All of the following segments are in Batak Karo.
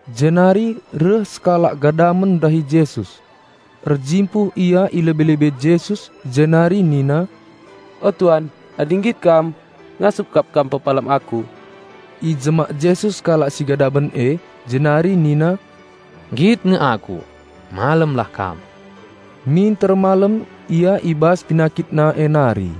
Jenari reh sekalak gadamen ndahi Jesus. Erjimpuh ia i lebe-lebe Jesus jenari nina, "O Tuan, adi nggit Kam, ngasup kap Kam pepalem aku." Ijemak Jesus kalak si gadamen e jenari Nina, "Nggit nge aku. Malemlah kam!" Minter malem ia i bas penakitna e nari.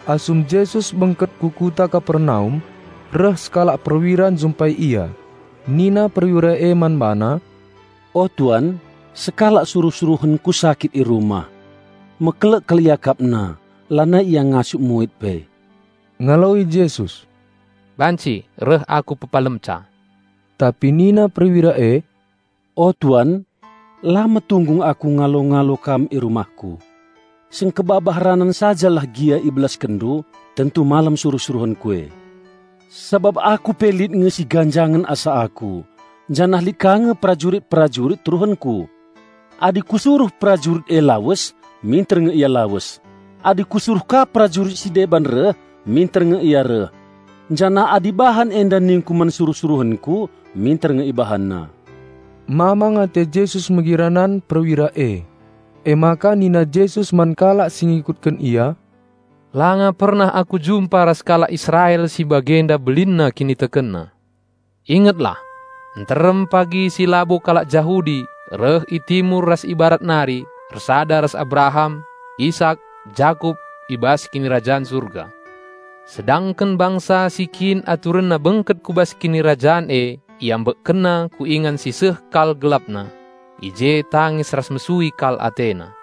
Asum Jesus bengket ku kuta Kapernaum, reh sekalak perwira njumpai Ia. Nina perwira e man BaNa, "O Tuan, sekalak suruh-suruhenku sakit i rumah. Mekelek kal iakapna, lanai ia ngasup muit pe." Ngaloi Jesus, "Banci reh Aku pepalemca." Tapi nina perwira e, "O Tuan, la metunggung aku ngalo-ngalo Kam i rumahku. Sengkebabah ranan sajalah gia IbelaskenNdu, tentu malem suruh-suruhenku e. Sabap aku pe lit nge si ganjangen asa aku, janah lit ka nge perajurit-perajurit teruhenku. Adi kusuruh perajurit e lawes, minter nge ia lawes; adi kusuruh ka perajurit si deban reh, minter nge ia reh; janah adi bahan enda ningku man suruh-suruhenku, minter nge ibahanna." Mamang ate Jesus megi ranan perwira e. Emaka nina Jesus man kalak si ngikutken Ia, "Langa pernah Aku jumpa ras kalak Israel si bagenda belinna kinitekenna. Ingetlah! Nterem pagi si labo kalak Jahudi reh i Timur ras i Barat nari ersada ras Abraham, Isak, Jakup i bas Kinirajan Surga. Sedangken bangsa si kin aturenna bengket ku bas Kinirajan e IambekkenNa ku ingan si seh kal gelapna. I je tangis ras mesui kal atena."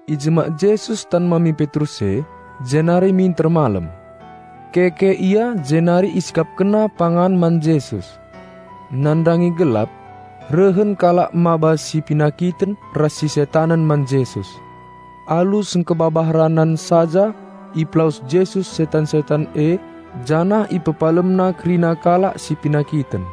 Ijemak Jesus tan mami Petrus e, jenari minter malem. Keke ia jenari isikapkenna pangan man Jesus. Nandangi gelap, rehen kalak maba si penakiten ras si setanen man Jesus. Alu sengkebabah ranan saja ipelawes Jesus setan-setan e janah IpepalemNa kerina kalak si penakiten.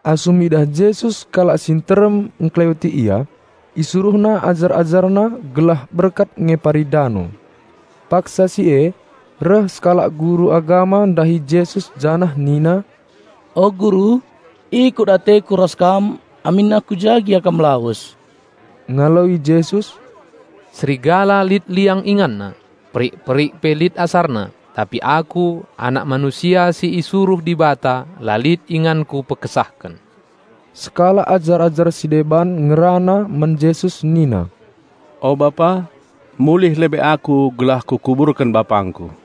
Asum idah Jesus kalak si nterem ngkeleweti Ia, IsuruhNa ajar-AjarNa gelah berkat ngepari dano. Paksa si e, reh sekalak guru agama ndahi Jesus janah nina, "O Guru, ikut ateku ras Kam aminna ku ja gia Kam lawes." Ngaloi Jesus, "Serigala lit liang inganna, perik-perik pe lit asarna, tapi Aku, Anak Manusia si isuruh Dibata la lit inganKu pekesahken." Sekalak ajar-ajar si deban ngerana man Jesus nina, "O Pa, mulih lebe aku gelah kukuburken bapangku."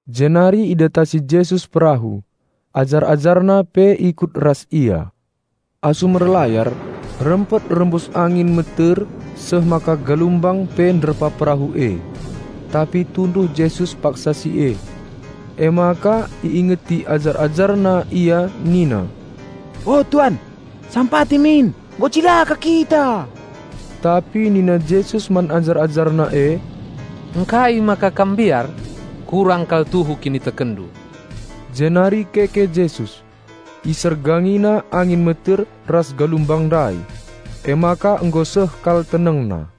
Jenari idatasi Jesus perahu, ajar-AjarNa pe ikut ras Ia. Asum erlayar, rempet rembus angin meter seh maka galumbang pe ngantur perahu e. Tapi tunduh Jesus paksa si e. Emaka iingeti ajar-AjarNa Ia nina, "O Tuan, sampati min! Nggo cilaka kita!" Tapi nina Jesus man ajar-AjarNa e, "Ngkai maka kam mbiar? Kurang kal tuhu kinitekenndu!" Jenari keke Jesus, isergangina angin meter ras galumbang ndai. Emaka nggo seh kal tenengna.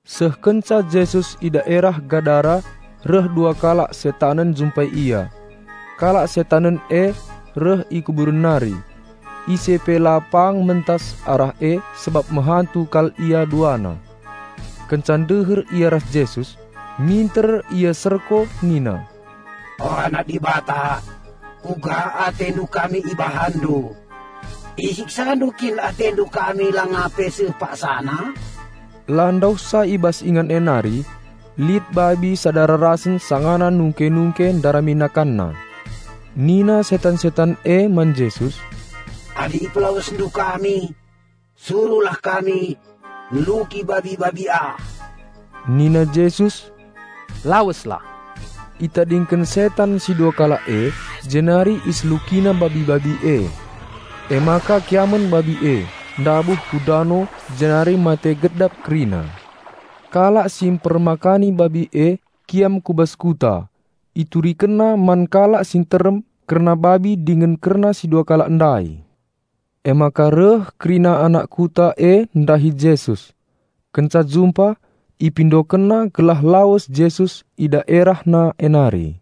Seh kenca Jesus i daerah Gadara reh dua kalak setanen njumpai Ia. Kalak setanen e reh i kuburen nari. Ise pe la pang mentas arah e sabap mehantu kal ia duana. Kenca ndeher ia ras Jesus, minter ia serko nina, "O Anak Dibata, kuga atendu kami IbahanNdu? IsiksaNdu kin AteNdu kami langa pe seh paksana?" La ndauhsa i bas ingan e nari, lit babi sada rarasen sangana nungke-nungke ndarami nakanna. Nina setan-setan e man Jesus, "Adi IpelawesNdu kami, suruhlah kami neluki babi-babi ah." Nina Jesus, "Laweslah!" Itadingken setan si dua kalak e jenari iselukina babi-babi e. Emaka kiamen babi e, ndabuh ku dano jenari mate gedap kerina. Kalak si mpermakani babi e kiam ku bas kuta. Iturikenna man kalak si nterem kerna babi dingen kerna si dua kalak ndai. Emaka reh kerina anak kuta e ndahi Jesus. Kenca jumpa, ipindokenna gelah lawes Jesus i daerahna e nari.